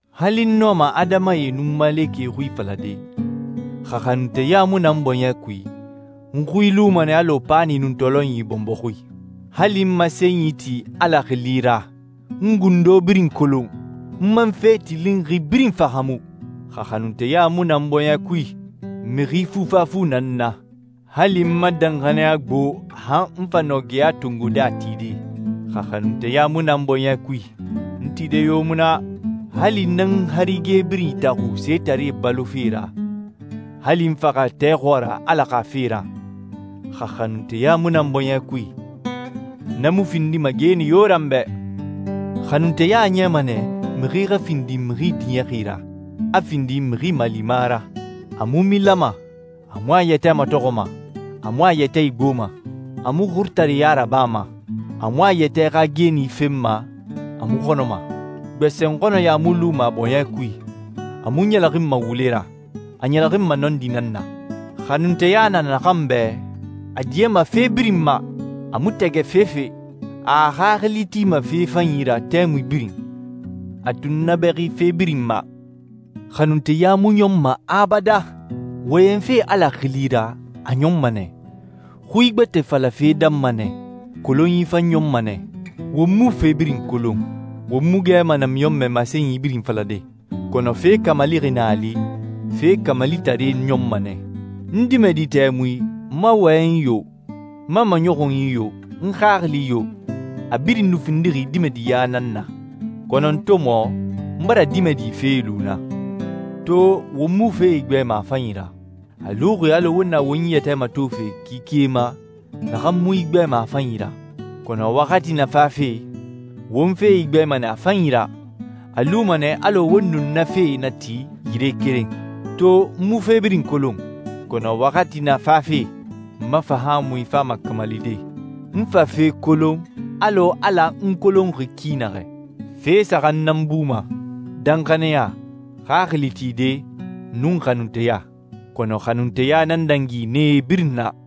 Hali n nɔma adamae nun malekɛe xui falade, xa xanunteya mu na n bɔɲɛ kui, n xui luma nɛ alɔ paani nun tɔlɔnyi bɔnbɔ xui. Hali n masenyi ti Ala xili ra, n gundo birin kolon, n man fe tilinxi birin fahaamu, xa xanunteya mu na n bɔɲɛ kui, mixi fufafu nan n na. Hali n ma danxaniya gbo han n fa nɔ geya tongode a tide, xa xanunteya mu na n bɔɲɛ kui, n tide yo mu na. Hali n nan n harige birin itaxun setaree balofe ra, hali n faxa tɛ xɔɔra Ala xa fe ra, xa xanunteya mu na n bɔɲɛ kui, na mu findima geeni yo ra n bɛ. Xanunteya a niyama nɛ mixi xa findi mixi diɲɛxi ra, a findi mixi malima ra. A mu milama, a mu a yɛtɛ matɔxɔma, a mu a yɛtɛ igboma, a mu xurutareɲa rabama, a mu a yɛtɛ xa geeni fenma, a mu xɔnɔma. Gbɛsɛnxɔnnɛya mu luma a bɔɲɛ kui, a mu ɲɛlɛxinma wule ra, a ɲɛlɛxinma nɔndi nan na. Xanunteya na naxan bɛ, a diɲɛma fe birin ma, a mu tɛgɛ fefe, a a xaxili tima fe fanyi ra tɛmui birin, a tunnabɛxi fe birin ma. Xanunteya mu ɲɔnma abadan. Wɔyɛnfe Ala xili ra a ɲɔnma nɛ, xui gbɛtɛe falafe danma nɛ, kolonyi fan ɲɔnma nɛ. Won mu fe birin kolon, won mu gɛma namiɲɔnmɛ masenyi birin falade, kɔnɔ fe kamalixi na a li, fe kamalitare ɲɔnma nɛ. N dimɛdi tɛmui, n ma wɔyɛnyi yo, n ma maɲɔxunyi yo, n xaxili yo, a birin nu findixi dimɛdiɲa nan na. Kɔnɔ n to mɔ, n bara dimɛdi fee lu na. To won mu fee igbɛma a fanyi ra. A luxi alɔ won na won yɛtɛ matofe kike ma naxan mu igbɛma a fanyi ra. Kɔnɔ waxati na fafe, won fee igbɛma nɛ a fanyi ra, a luma nɛ alɔ won nun na fee na ti yire keren. To n mu fe birin kolon, kɔnɔ waxati na fafe, n ma fahaamui fama kamalide, n fa fe kolon alɔ Ala n kolonxi ki naxɛ. Fe saxan nan buma: danxaniya, xaxili tide, nun xanunteya. Kɔnɔ xanunteya nan dangi nee birin na.